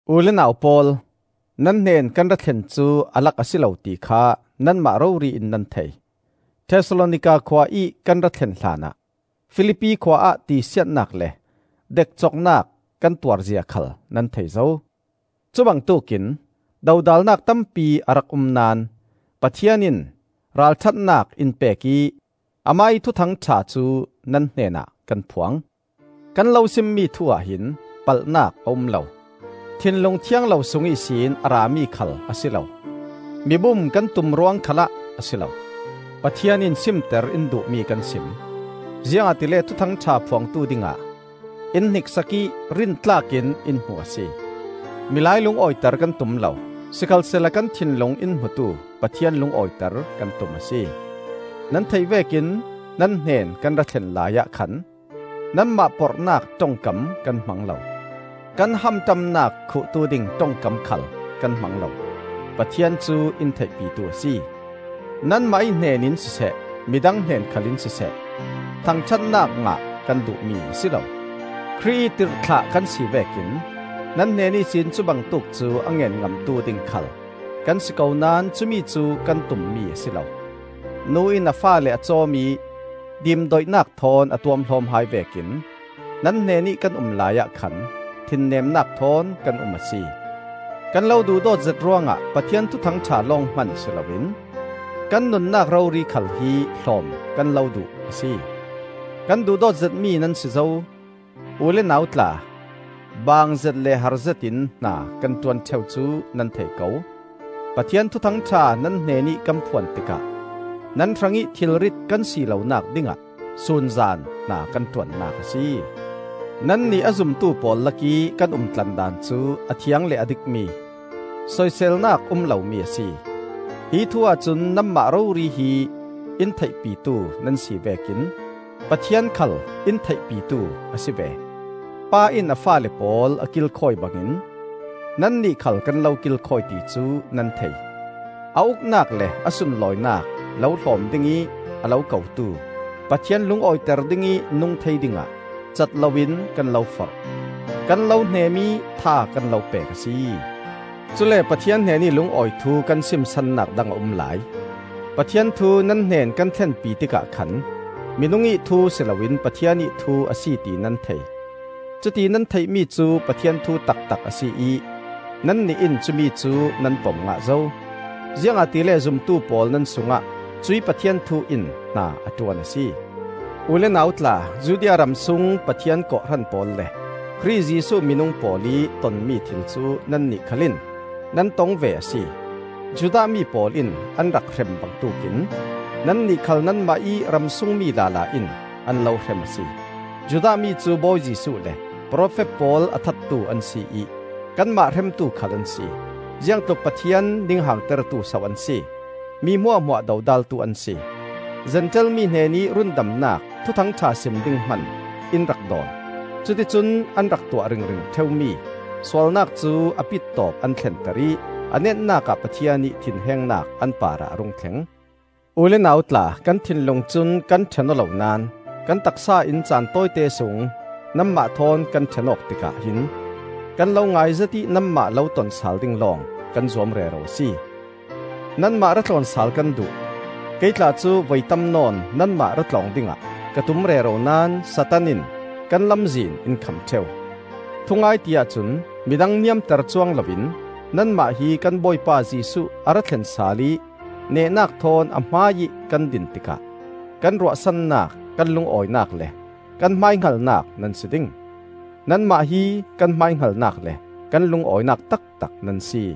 U le nau pawl, nan hnen kan ra thlen cu a lak a si lo ti kha nanmah rori in nan thei. Thesalonika khua ih kan ra thlen hlanah Filipi khua ah tisiatnak le dekcoknak kan tuar zia khal nan thei zo. Cubangtuk in dodalnak tampi a rak um naón Pathian in ralṭhatnak in pek ih amah ih Thuthang ṭha cu nan hnenah kan phuang. Kan lo simmi thu-ah hin palhnak a um lo, thinlung thiang lo sung ihsin a rami khal a si lo, mibum kan tum ruang khalah a si lo. Pathian in simter in duhmi kan sim, ziangahtile Thuthang ṭha phuangtu dingah in hniksak ih rintlak in in hmu a si. Milai lungawiter kan tum lo, sikhalsehla kan thinlung in hmutu Pathian lungawiter kan tum a si. Nan theih vekin nan hnen kan ra thlen laiah khan nanmah porhnak ṭongkam kan hmang lo; kan hamṭamnak khuhtu ding ṭongkam khal kan hmang lo; Pathian cu in theihpitu a si. Nanmah ih hnenin siseh, midang hnen khalin siseh, thangṭhatnak ngah kan duhmi a si lo. Khrih ih tirhthlah kan si vekin nan hnen ihsin cubangtuk cu a ngen ngamtu ding khal kan si ko naón cumicu kan tum mi a si lo. Nu in a faale a cawm ih dimdoihnak thawn a tuamhlawm hai vekin nan hnenih kan um laiah khan thinnemnak thawn kan um a si. Kan lo duhdawtzet ruangah Pathian Thuthang ṭha lawng hman si loin kan nunnak rori khal hi hlawm kan lo duh a si. Kan duhdawtzetmi nan si zo. U le nau tla, baangzet le harzet in hna kan ṭuan ṭheu cu nan thei ko. Pathian Thuthang ṭha nan hnenih kan phuan tikah nan hrangih thilrit kan si lonak dingah sunzan hna kan ṭuannak a si. Nannih a zumtu pawl lakih kan umtlandan cu a thiang le a dikmi, soiselnak um lomi a si. Hi thu ahcun nanmah rori hi in theihpitu nan si vekin Pathian khal in theihpitu a si ve. Pa in a faale pawl a kilkhawi bangin nannih khal kan lo kilkhawi ti cu nan thei. A Uknak le a sunlawinak lo hlawm dingih a lo kotu Pathian lungawiter dingih nung thei dingah cat loin kan lo forh, kan lo hnem ih tha kan lo pek a si. Cule Pathian hnenih lungawi thu kan sim sannak dang a um lai. Pathian thu nan hnen kan thlenpi tikah khan minung ih thu si loin Pathian ih thu a si ti nan thei; cuti nan theihmi cu Pathian thu taktak a si ih nannih in cumi cu nan pom ngah zo. Ziangahtile zumtu pawl nan sungah cuih Pathian thu in hna a ṭuan a si. U le nau tla, Judea ramsung Pathian kawhhran pawl le Khrih Jesuh minung pawl ih tonmi thil cu nannih khalin nan tong ve a si. Judah mi pawl in an rak hrem bangtuk in nannih khal nanmah ih ramsungmi lala in an lo hrem a si. Judah mi cu Bawi Jesuh le profet pawl a thattu an si ih kanmah hremtu khal an si. Ziangtluk Pathian ninghangtertu so an si! Mi hmuahhmuah dodaltu an si! Zentail mi hnenih rundamnak Thuthang ṭha sim ding hman in rak dawn. Cuticun an rak tuah ringring ṭheumi sualnak cu a pittawp an thlenter ih a netnak ah Pathian ih thinhengnak an parah a rung thleng. U le nau tla, kan thinlung cun kan ṭhen aw lo naón kan taksa in caan tawite sung nanmah thawn kan ṭhen awk tikah hin kan lo ngai zet ih nanmah lo ton sal ding lawng kan zuam rero a si. Nanmah ra tlawn sal kan duh. Kei tla cu voi tam nawn nanmah ra tlawng dingah ka tum rero naón Satan in kan lamzin in kham ṭheu. Thungai ti-ah cun, midang niamter cuang loin, nanmah hi kan Bawipa Jesuh a ra thlen sal ih nehnak thawn a hmaiih kan din tikah, kan ruahsannak, kan lungawinak le kan hmaihngalnak nan si ding. Nanmah hi kan hmaihngalnak le kan lungawinak taktak nan si.